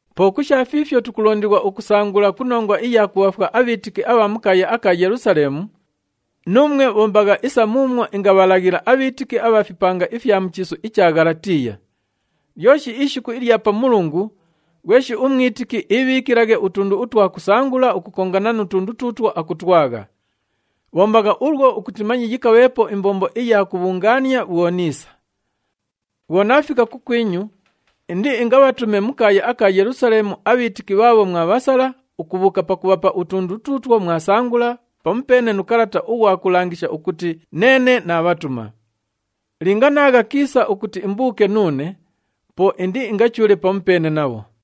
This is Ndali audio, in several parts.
Po ku sha fiifyo tukulondighwa ukusangula ku nongwa iya kubhaafwa abhiitiki abha mu kaaya aka Yelusaleemu, nuumwe bhombagha isa muumwo ingabhalaghila abhiitiki abha fipanga ifya mu chiisu icha Ghalatiiya. Lyoshi ishiku ilya Pamulungu, ghweshi umwitiki iibhiikilaghe utundu utwa kusangula ukukongana nu tundu tuutwo akutwagha. Bhombagha ulwo ukuti manye yikabheepo imbombo iya kubhungaania bhwo niisa. Bhwo naafika kukwinyu, indiingabhatume mu kaaya aka Yelusaleemu abhiitiki bhaabho mwabhasala ukubhuuka pakubhapa utundu tuutwo mwasangula pamupeene nu kalata ughwa kulangisha ukuti neene naabhatuma. Linga naagha kiisa ukuti imbuuke nuune, po indiingachuule pamupeene nabho.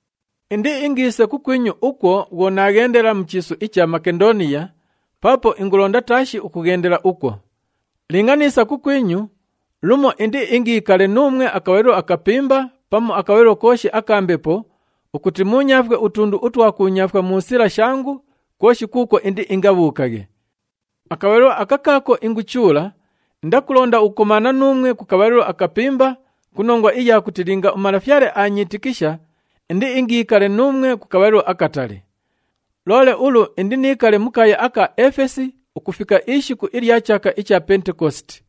Indiingiise kukwinyu ukwo bhwo naaghendela mu chiisu icha Makendooniya paapo ingulonda taashi ukughendela ukwo. Linga niisa kukwinyu, lumo indiingiikale nuumwe akabhalilo akapimba pamu akabhalilo kooshi aka mbepo ukuti muunyaafwe utundu utwa kuunyaafwa mu sila shangu kwoshi kuukwo indiingabhuukaghe. Akabhalilo aka kaako inguchuula, indakulonda ukukomaana nuumwe ku kabhalilo akapimba ku nongwa iya kuti linga uMalafyale aanyiitikisha indiingiikale nuumwe ku kabhalilo akatali. Loole ulu indiniikale mu kaaya aka Efesi ukufika ishiku ilya chaaka icha Pentekositi.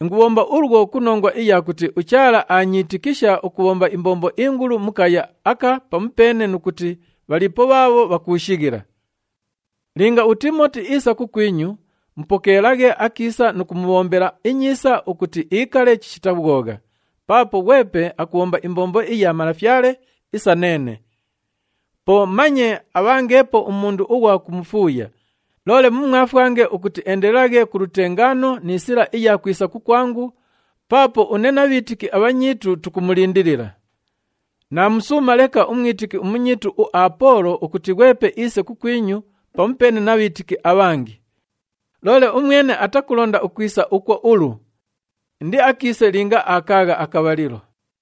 Ingubhomba ulwo ku nongwa iya kuti uChaala aanyiitikisha ukubhomba imbombo ingulu mu kaaya aka pamupeene nu kuti bhaliipo bhaabho bhakuushighila. Linga uTiimoti iisa kukwinyu, mupokeelaghe akiisa nu kumubhombela inyiisa ukuti iikale chishita bhwogha, paapo ghwepe akubhomba imbombo iya Malafyale isa neene. Po manye abhangeepo umundu ughwa kumufuuya, loole mumwafwange ukuti eendelelaghe ku lutengaano ni sila iya kwisa kukwangu, paapo une na bhiitiki abhanyiitu tukumulindilila. Naamusuuma leka umwitiki umunyiitu uApoolo ukuti ghwepe iise kukwinyu pamupeene na bhiitiki abhangi. Loole umwene atakulonda ukwisa ukwo ulu. Indiakiise linga aakaagha akabhalilo.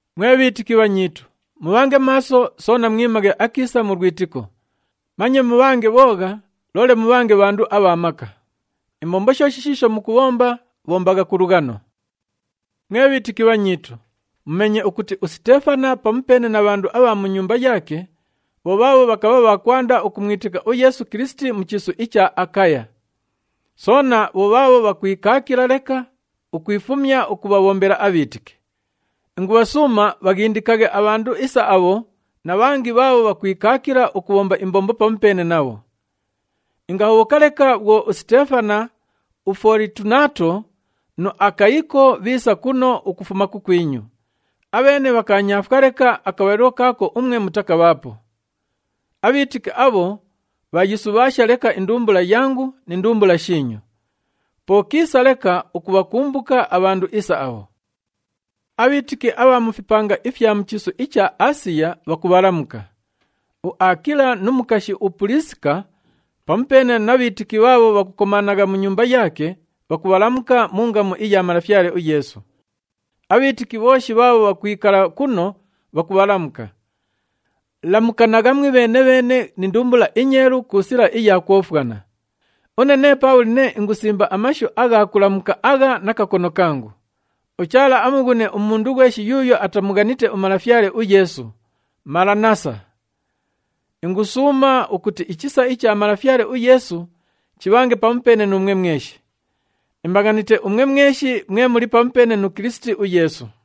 Mwe bhiitiki bhanyiitu, mubhange maaso, soona mwimaghe akiisa mu lwitiko. Manye mubhange bhoogha, loole mubhange bhandu abha maka. Imbombo shooshi shiisho mukubhomba, bhombagha ku lughano. Mwe bhiitiki bhanyiitu, mumeenye ukuti uSiteefana pamupeene na bhandu abha mu nyumba yaake bho bhaabho bhakabha bha kwanda ukumwitika uYeesu Kilisiti mu chiisu icha Akaya. Soona bho bhaabho bhakwikaakila leka ukwifumya ukubhabhombela abhiitiki. Ingubhasuuma bhaghindikaghe abhandu isa abho na bhangi bhaabho bhakwikaakila ukubhomba imbombo pamupeene nabho. Ingahobhoka leka bhwo uSiteefana, uFolitunaato nu Akayiko, bhiisa kuno ukufuma kukwinyu. Abheene bhakaanyaafwa leka akabhalilo kaako umwe mutakabhaapo. Abhiitiki abho, bhaayisubhaasha leka indumbula yangu ni ndumbula shiinyu. Po kiisa leka ukubhakumbuka abhandu isa abho. Abhiitiki abha mu fipanga ifya mu chiisu icha Aasiya bhakubhalamuka. UAakila nu mukashi uPuliisika pamupeene na bhiitiki bhaabho bhakukomaanagha mu nyumba yaake, bhakubhalamuka mu ngamu iya Malafyale uYeesu. Abhiitiki bhooshi bhaabho bhakwikala kuno, bhakubhalamuka. Lamukanagha mwibheene-bheene ni ndumbula inyeelu ku sila iya kwofwana. Une nee Paabhuli nee ingusimba amashu agha kulamuka agha na kakono kangu. UChaala amughune umundu ghweshi yuuyo atamughanite uMalafyale uYeesu. Malanaasa! Ingusuuma ukuti ichisa icha Malafyale uYeesu chibhange pamupeene nuumwe mweshi. Imbaghanite umwe mweshi mwe muli pamupeene nu Kilisiti uYeesu.